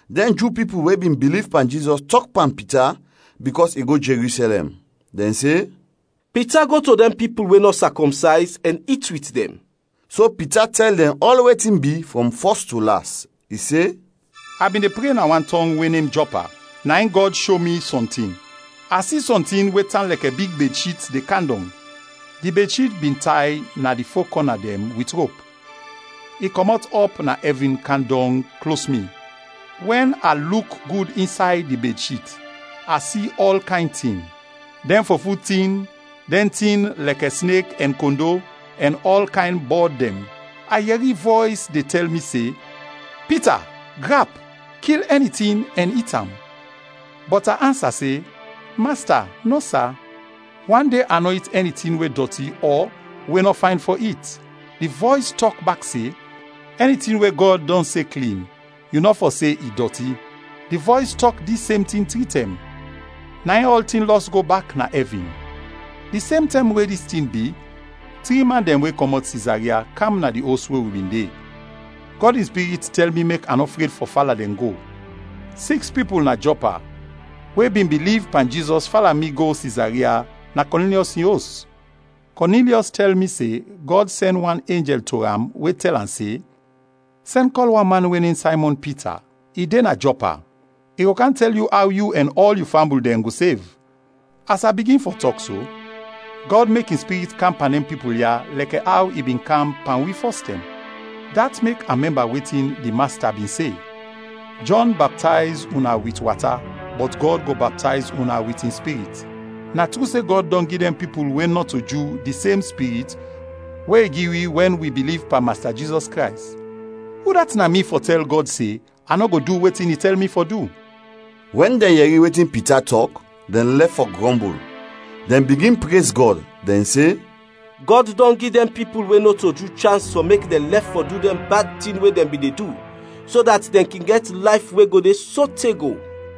Dɛn Ju pipul we bin biliv pan Jizɔs tɔk pan Pita bikɔs i go Jerusɛlɛm. Dɛn se, “Pita go to dɛn pipul we nɔ sakɔmsayz ɛn it wit dɛn.” So Pita tɛl dɛn ɔl wetin bi frɔm fɔs to las. I se, “A bin de pre na wan tɔng we nem Jɔpa, na in Gɔd sho mi sɔntin. A si sɔntin we tan lɛkɛ big bedshit de kam dɔng. Di bedshit bin tay na di fo kɔna dɛn wit rop. I kɔmɔt ɔp na ɛvin kam dɔng klos mi. Wɛn a luk gud insay di bedshit, a si ɔl kayn tin dɛn fofut tin, dɛn tin lɛkɛ snek ɛn kondo, ɛn ɔl kayn bɔd dɛn. A yɛri vɔys de tɛl mi se, ‘Pita, grap; kil ɛni tin ɛn it am!’ Bɔt a ansa se, ‘Masta, nɔ, sa; wan de a nɔ it ɛni tin we dɔti ɔ we nɔ fayn fɔ it.’ Di vɔys tɔk bak se, ‘Ɛni tin we Gɔd dɔn se klin, yu nɔ fɔ se i dɔti.’ Di vɔys tɔk dis sem tin tri tɛm, na in ɔltin lɔs go bak na ɛvin. Di sem tɛm we dis tin bi, tri man dɛn we kɔmɔt Sizaria, kam na di os we wi bin de. Gɔd in Spirit tɛl mi mek a nɔ fred fɔ fala dɛn go. Siks pipul na Jɔpa we bin biliv pan Jizɔs fala mi go Sizaria na Kɔnilyɔs in os. Kɔnilyɔs tɛl mi se Gɔd sɛn wan enjɛl to am we tɛl am se, ‘Sɛn, kɔl wan man we nem Saymɔn Pita. I de na Jɔpa. I go kam tɛl yu aw yu ɛn ɔl yu fambul dɛn go sev.’ As a bigin fɔ tɔk so, Gɔd mek in Spirit kam pan dɛn pipul ya lɛkɛ aw i bin kam pan wi fɔstɛm. Dat mek a mɛmba wetin di Masta bin se, ‘Jɔn baptayz una wit wata bɔt Gɔd go baptayz una wit in Spirit.’ Na tru se Gɔd dɔn gi dɛn pipul we nɔto Ju di sem Spirit we i gi wi wɛn wi biliv pan Masta Jizɔs Krays. Udat na mi fɔ tɛl Gɔd se a nɔ go du wetin i tɛl mi fɔ du?” Wɛn dɛn yɛri wetin Pita tɔk, dɛn lɛf fɔ grɔmbul. Dɛn bigin prez Gɔd, dɛn se, “Gɔd dɔn gi dɛn pipul we nɔto Ju chans fɔ mek dɛn lɛf fɔ du dɛn bad tin we dɛn bin de du, so dat dɛn kin gɛt layf we go de sote go.”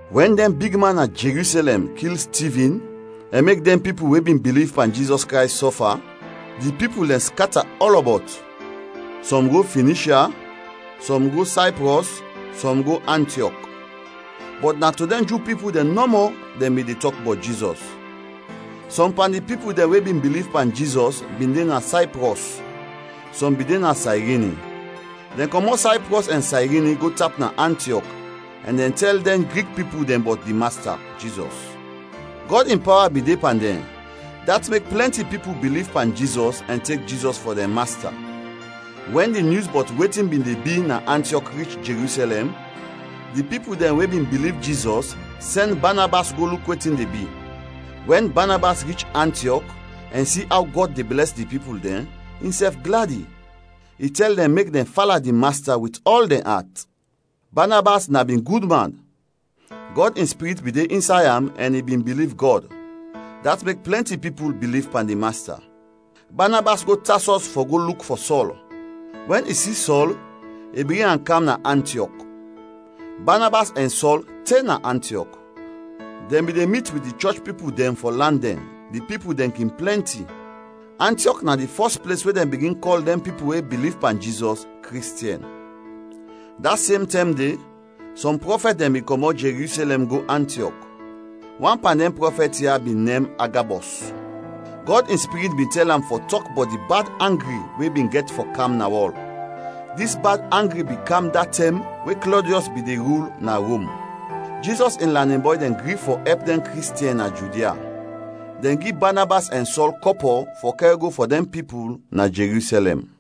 Wɛn dɛn bigman na Jerusɛlɛm kil Stivin ɛn mek dɛn pipul we bin biliv pan Jizɔs Krays sɔfa, di pipul dɛn skata ɔlɔbɔt. Sɔm go Finishya, sɔm go Sayprɔs, sɔm go Antiɔk. Bɔt na to dɛn Ju pipul dɛn nɔmɔ dɛn bin de tɔk bɔt Jizɔs. Sɔm pan di pipul dɛn we bin biliv pan Jizɔs bin de na Sayprɔs, sɔm bin de na Sayrini. Dɛn kɔmɔt Sayprɔs ɛn Sayrini go tap na Antiɔk ɛn dɛn tɛl dɛn Grik pipul dɛn bɔt di Masta, Jizɔs. Gɔd in pawa bin de pan dɛn, dat mek plɛnti pipul biliv pan Jizɔs ɛn tek Jizɔs fɔ dɛn Masta. Wɛn di nyus bɔt wetin bin de bi na Antiɔk rich Jerusɛlɛm, di pipul dɛn we bin biliv Jizɔs sɛn Banabas go luk wetin de bi. Wɛn Banabas rich Antiɔk ɛn si aw Gɔd de blɛs di pipul dɛn, insɛf gladi. I tɛl dɛn mek dɛn fala di Masta wit ɔl dɛn at. Banabas na bin gud man; Gɔd in Spirit bin de insay am ɛn i bin biliv Gɔd. Dat mek plɛnti pipul biliv pan di Masta. Banabas go Tasɔs fɔ go luk fɔ Sɔl. Wɛn i si Sɔl, i bring am kam na Antiɔk. Banabas ɛn Sɔl te na Antiɔk. Dɛn bin de mit wit di chɔch pipul dɛn fɔ lan dɛn, di pipul dɛn kin plɛnti. Antiɔk na di fɔs ples we dɛn bigin kɔl dɛn pipul we biliv pan Jizɔs, Kristiɛn. Da sem tɛm de, sɔm prɔfɛt dɛn bin kɔmɔt Jerusɛlɛm go Antiɔk. Wan pan dɛn prɔfɛt ya bin nem Agabɔs. Gɔd in Spirit bin tɛl am fɔ tɔk bɔt di bad angri we bin gɛt fɔ kam na wɔl. Dis bad angri bin kam da tɛm we Klɔdiɔs bin de rul na Rom. Jizɔs in lanin bɔy dɛn gri fɔ ɛp dɛn Kristiɛn na Judia. Dɛn gi Banabas ɛn Sɔl kɔpɔ fɔ kɛr go fɔ dɛn pipul na Jerusɛlɛm.